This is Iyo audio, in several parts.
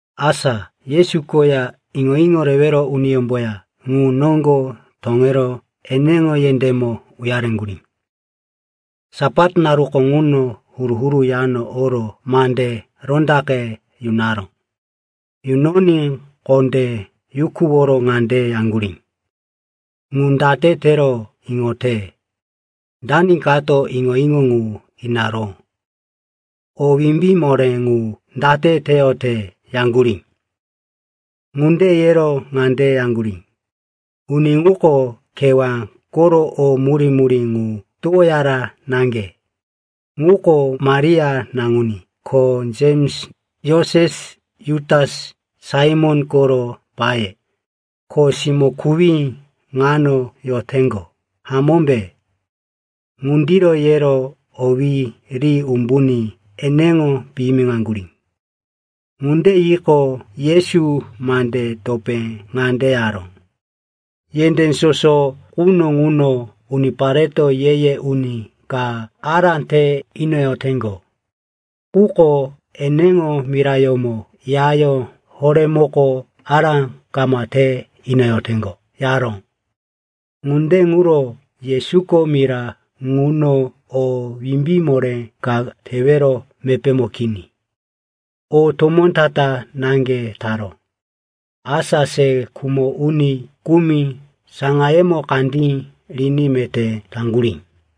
Asa Yesu koya iŋo-iŋo rewero uniyómboya ŋu noŋgo toŋero eneŋo yendémo uyareŋgurí. Sapat naruko ŋuno huru-huru yano oro mande rondaqe yunaró. Ŋuno huru-huru yano oro mande rondaqe yunaró. Yunoní kondé yukuworo ŋande yaŋgurí, “Ŋu date tero iŋote? Dani kato iŋo-iŋo ŋu inaró? O wimbí moré ŋu date teyote?” yaŋgurí. Ŋunde yero ŋande yaŋgurí, “Uni ŋuko kewá koro o murí-murí ŋu towoyara naŋge. Ŋuko Maria naŋuní, ko Jems, Joses, Jutas, Saimon koro paye, ko siwo-kuwí ŋano yoteŋgo, hamómbe?” Ŋundiro yero owí ri umbuní eneŋo piyimiŋaŋgurí. Ŋunde yiqo, Yesu mande topé ŋande yaró, “Yendé soso quno ŋuno unipareto ye-ye uni ka ará te inoyoteŋgo. Quko eneŋo mirayómo, yayó horémoko ará kama te inoyoteŋgo,” yaró. Ŋunde ŋuro Yesuko mira ŋuno o wimbí moré ka tewero mepémo kini. O tomó ta-ta naŋge taró. Asa, se khumo uni kumi saŋayemo kandí riní meté taŋgurí.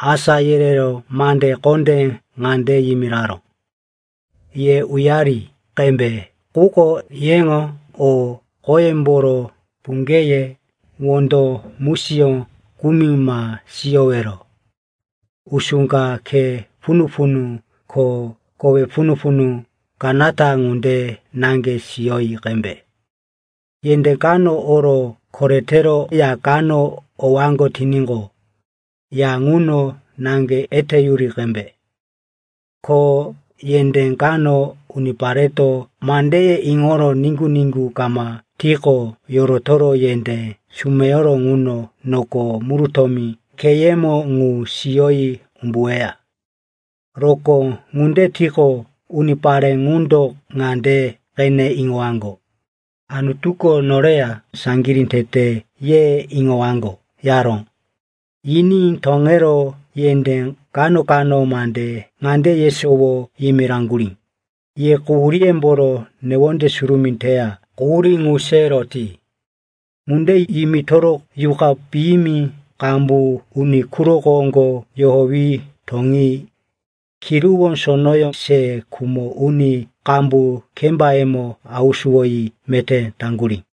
Asá yerero mande kondé ŋande yimiraró, “Ye uyari qembe, quko yeŋo o qoyemboro, puŋgeye, wondo musiyó kumi ma siyowero. Usú ka, khe punu-punu ko kowe punu-punu kanata ŋunde naŋge siyoyi qembe. Yendé kano oro koretero ya kano owaŋgo tiníqo, ya ŋuno naŋge eteyuri qembe. Ko yendé kano unipareto mandeye iŋoro niŋgu-niŋgu kama tiqo, yorotoro yendé sumeyoro ŋuno noko murutómi kheyemo ŋu siyoyi umbuweya. Rokó ŋunde tiqo, unipare ŋundo ŋande qene iŋowaŋgo, ‘Anutuko noreya saŋgirí tete,’ ye iŋowaŋgo,” yaró. Yiní toŋero yendé kano-kano mande ŋande yesowo yimiraŋgurí, “Ye quhuríyemboro newonde surumí teya quhurí ŋu se roti.” Ŋunde yimitoro yuqa piyimi qambu uni quro koŋgo yohowi toŋi, kiruwó sonoyó se khumo uni qambu kembayemo hausuwoyi meté taŋgurí.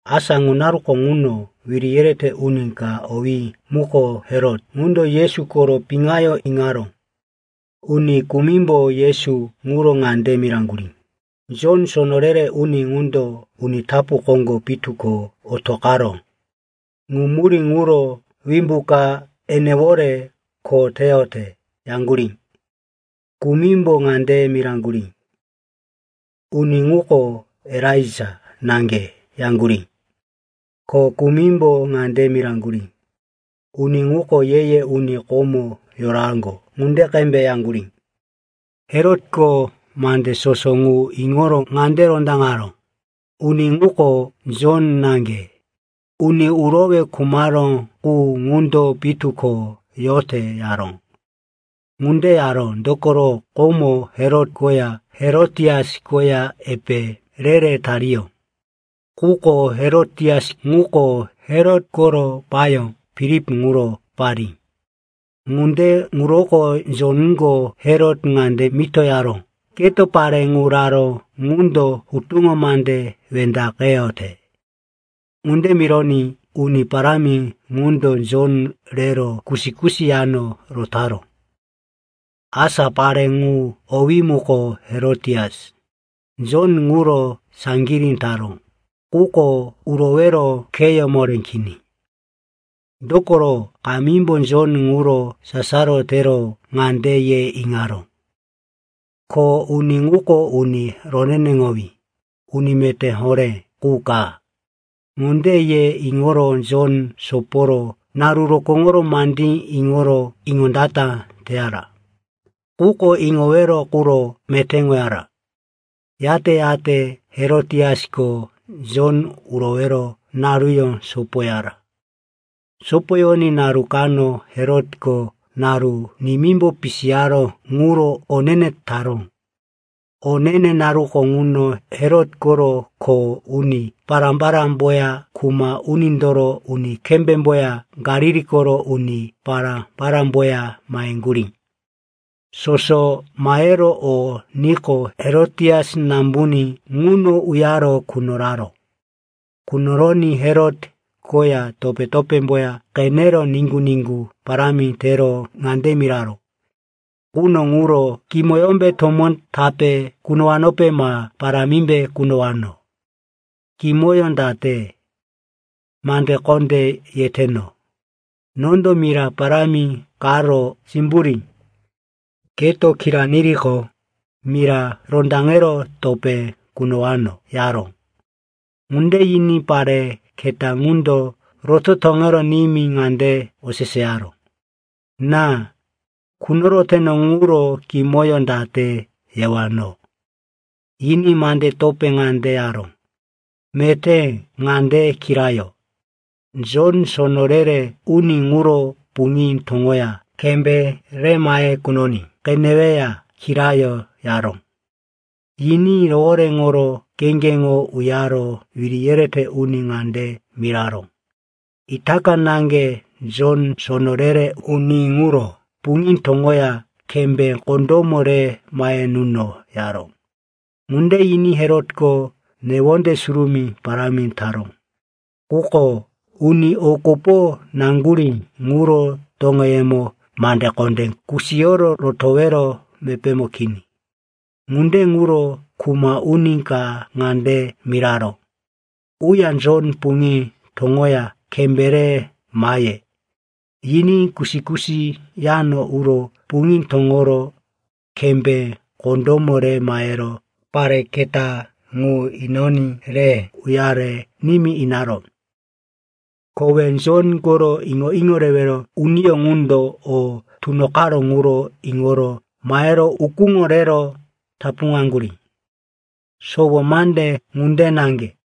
Asa ŋu naruko ŋuno wiri yerete uni ka, owí muko Herot, ŋundo Yesu koro piŋayó iŋaró. Uni kumimbo Yesu ŋuro ŋande miraŋgurí, “Jon, sono re-re uni ŋundo uni tapu koŋgo pitu ko otoqaró. Ŋu murí ŋuro wimbu ka enewore kho teyote,” yaŋgurí. Kumimbo ŋande miraŋgurí, “Uni ŋuko Elaija naŋge,” yaŋgurí. Ko kumimbo ŋande miraŋgurí, “Uni ŋuko ye-ye uni komo yoraŋgo ŋunde qembe,” yaŋgurí. Herotko mande soso ŋu iŋoro ŋande rondaŋaró, “Uni ŋuko Jon naŋge, uni urowe khumaró qu ŋundo pitu ko yote,” yaró. Ŋunde yaró, dokoro komo Herot koya Herotias koya epe re-re tariyó. Quko Herotias ŋuko Herot koro payó Filip ŋuro parí. Ŋunde ŋuroko Jonko Herot ŋande mito yaró, “Keto pare ŋu raró ŋundo hutuŋo mande wendaqeyote.” Ŋunde mironí uni parámi ŋundo Jon rero kusi-kusi yano rotaró. Asa pare ŋu, owí muko Herotias, Jon ŋuro saŋgirí taró, quko urowero kheyó moré kini. Dokoro kamímbo Jon ŋuro sasaro tero ŋande ye iŋaró, ko uni ŋuko uni roneneŋowí, uni meté horé qu ka. Ŋunde ye iŋoro Jon soporo naru rokóŋoro mandí iŋoro iŋondata teyara, quko iŋowero quro metéŋoyara. Yate-yate Herotiasko Jon urowero naruyó sopoyara. Sopoyoní naru kano Herotko naru nimímbo pisiyaró ŋuro o ne-ne taró. O ne-ne naruko ŋuno Herot koro kho uni pará-parámboya kuma unindoro uni kembémboya Galili koro uni pará-parámboya maheŋgurí. Soso mahero o niqo, Herotias nambuní ŋuno uyaro qunoraró. Qunoroní Herot koya topé-topémboya qenero niŋgu-niŋgu parámi tero ŋande miraró, “Quno ŋuro kimoyómbe tomó tape kunowanope ma parámimbe kunowano. Kimoyó date? Mande kondé yeteno. Nondo mira parámi karo simburí. Keto kira niriqo, mira rondaŋero topé kunowano,” yaró. Ŋunde yiní pare keta ŋundo roto toŋero nimí ŋande oseseyaró, “Ná, qunoroteno ŋuro kimoyó date yewano?” Yiní mande topé ŋande yaró, “Meté ŋande kirayo. Jon, sono re-re uni ŋuro puŋí toŋoya kembé re mahe kunoní qeneweya kirayo,” yaró. Yiní rohoréŋoro kheŋgeŋo uyaro wiri yerete uni ŋande miraró, “Itaka naŋge Jon, sono re-re uni ŋuro puŋí toŋoya kembé kondómo re mahe nuno,” yaró. Ŋunde yiní Herotko newonde surumí parámi taró, quko uni o kopo naŋgurí ŋuro toŋeyemo mande kondé kusiyoro rotowero mepémo kini. Ŋunde ŋuro kuma uni ka ŋande miraró, “Uya Jon puŋí toŋoya kembé re mahe,” yiní kusi-kusi yano uro puŋí toŋoro kembé kondómo re mahero pare keta ŋu inoní re uyare nimí inaró. Kowe Jon koro iŋo-iŋo rewero uniyó ŋundo o tunoqaró ŋuro iŋoro mahero ukúŋo rero tapuŋaŋgurí. Sowo mande ŋunde naŋge.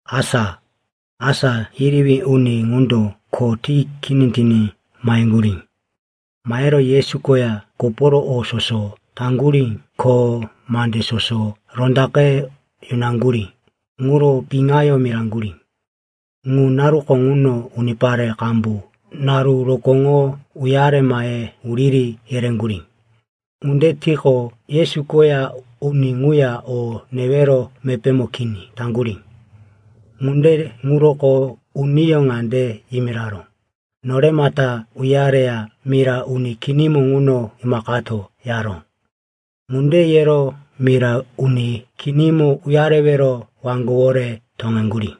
Asa asá yerewí uni ŋundo khoye ti kini tiní maheŋgurí. Mahero Yesu koya koporo o soso taŋgurí ko mande soso rondaqe yunaŋgurí ŋuro piŋayó miraŋgurí. Ŋu naruko ŋuno unipare qambu naru rokóŋo uyare mahe wuriri yereŋgurí. Ŋunde tiqo, Yesu koya uni ŋuya o newero mepémo kini taŋgurí. Ŋunde ŋuroko uniyó ŋande yimiraró, “Noremata uyareya mira uni kinimo ŋuno imaqato,” yaró. Ŋunde yero mira uni kinimo uyarewero waŋgowore toŋeŋgurí.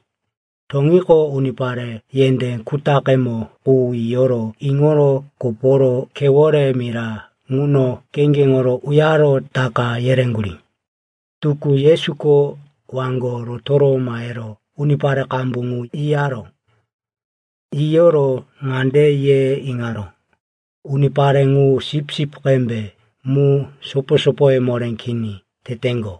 Toŋiqo, unipare yendé kutaqemo qu yiyo iŋoro koporo khewore mira ŋuno kheŋgeŋo uyaro taka yereŋgurí. Tukú Yesuko waŋgo rotoro mahero unipare qambu ŋu yiyaró. Yiyoro ŋande ye iŋaró, “Unipare ŋu sipsip qembe mu sopo-sopoye moré kini teteŋgo.”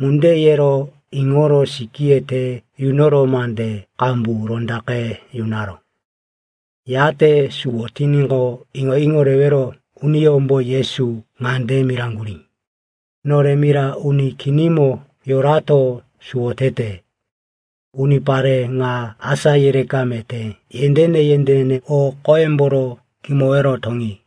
Ŋunde yero iŋoro sikíye te yunoro mande qambu rondaqe yunaró. Yate suwo tiníqo, iŋo-iŋo rewero uniyómbo Yesu ŋande miraŋgurí, “Nore mira uni kinimo yorato suwo tete. Unipare ŋa asá yereka meté yendéne-yendéne o qoyemboro kimowero toŋi.”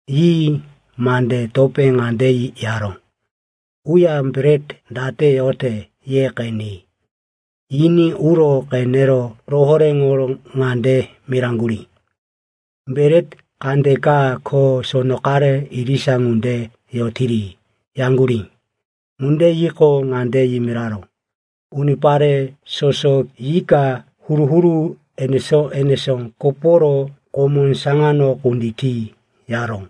Yi mande topé ŋande yaró, “Uya bret date yote ye qeni.” Yiní uro qenero rohoréŋoro ŋande miraŋgurí, “Bret kandeka ko sono qare irisa ŋunde yotiri,” yaŋgurí. Ŋunde yiqo, ŋande yimiraró, “Unipare soso yika huru-huru enesó-enesó koporo komó saŋano kunditi,” yaró.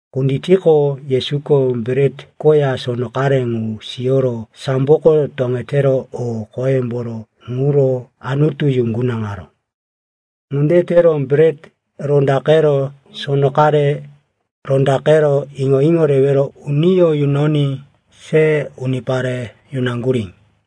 Kunditiqo, Yesuko bret koya sono qare ŋu siyoro samboko toŋetero o qoyemboro ŋuro Anutu yuŋgunaŋaró. Ŋunde tero bret rondaqero, sono qare rondaqero, iŋo-iŋo rewero uniyó yunoní se unipare yunaŋgurí.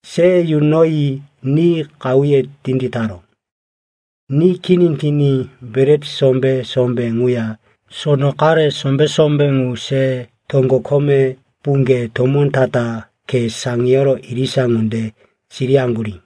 Se yunoyi ni qahuye tinditaró. Ni kini tiní bret sombé-sombé ŋuya sono qare sombé-sombé ŋu se toŋgo kome puŋge tomó ta-ta khe saŋiyoro irisa ŋunde siriyaŋgurí.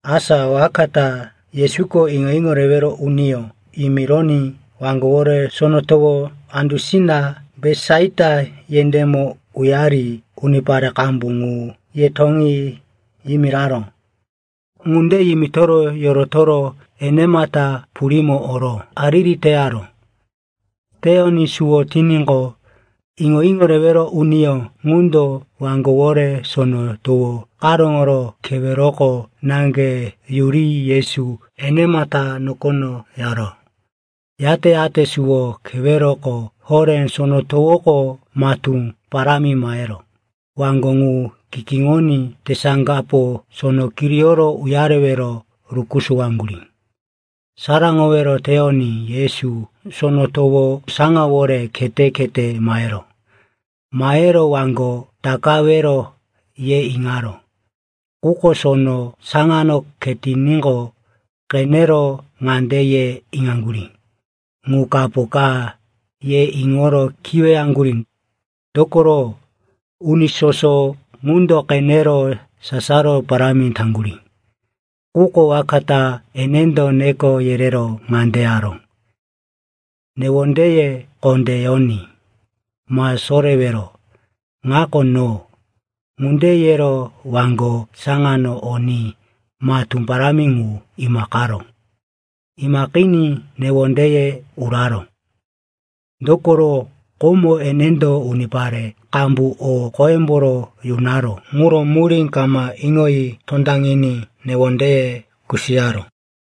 Asa waka ta Yesuko iŋo-iŋo rewero uniyó yimironí waŋgowore sono towo andusina Betisaita yendémo uyari unipare qambu ŋu “Ye toŋi,” yimiraró. Ŋunde yimitoro yorotoro enemata purímo oro hariri teyaró. Teyoní suwo tiníqo, iŋo-iŋo rewero uniyó ŋundo waŋgowore sono towo karóŋoro keweroko naŋge yuri Yesu enemata nokono yaró. Yate-yate suwo keweroko horé sono towoko matú parámi mahero waŋgo ŋu kikíŋoní tesaŋgapo sono kiriyoro uyarewero rukusuwaŋgurí. Saraŋowero teyoní Yesu sono towo saŋawore khete-khete maheró. Mahero, waŋgo takawero, ye iŋaró. Quko sono saŋano khetiníqo, qenero ŋande ye iŋaŋgurí, “Ŋu kapo ka,” ye iŋoro kiweyaŋgurí. Dokoro uni soso ŋundo qenero sasaro parámi taŋgurí. Quko waka ta enendo neko yerero ŋande yaró, “Newondeye kondé yoní. Ma sorewero. Ŋako no.” Ŋunde yero waŋgo saŋano oní, matú parámi ŋu imaqaró. Imaqiní newondeye uraró. Dokoro, komo enendo unipare qambu o qoyemboro yunaró ŋuro murí kama iŋoyi tondaŋiní newondeye kusiyaró.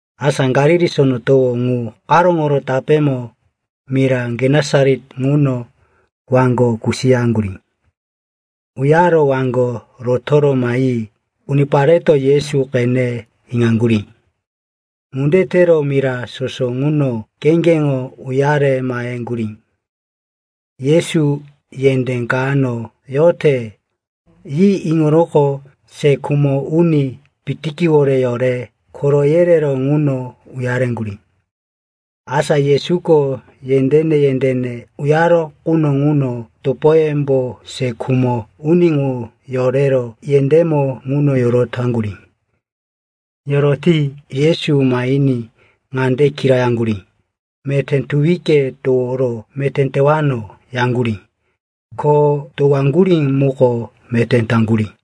Asa Galili Sono Towo ŋu karóŋoro tapémo, mira Genesaret ŋuno, waŋgo kusiyaŋgurí. Uyaro waŋgo rotoro mahi unipareto Yesu qene iŋaŋgurí. Ŋunde tero mira soso ŋuno kheŋgeŋo uyare maheŋgurí. Yesu yendé kano yote, yi iŋoroqo se khumo uni pitikiwore yore koro yerero ŋuno uyareŋgurí. Asa Yesuko yendéne-yendéne uyaró quno ŋuno topoyembo se khumo uni ŋu yorero yendémo ŋuno yorotaŋgurí. Yoroti Yesu mahiní ŋande kirayaŋgurí, “Meté tuwike toworo meté tewano,” yaŋgurí. Ko towaŋgurí muko meté taŋgurí.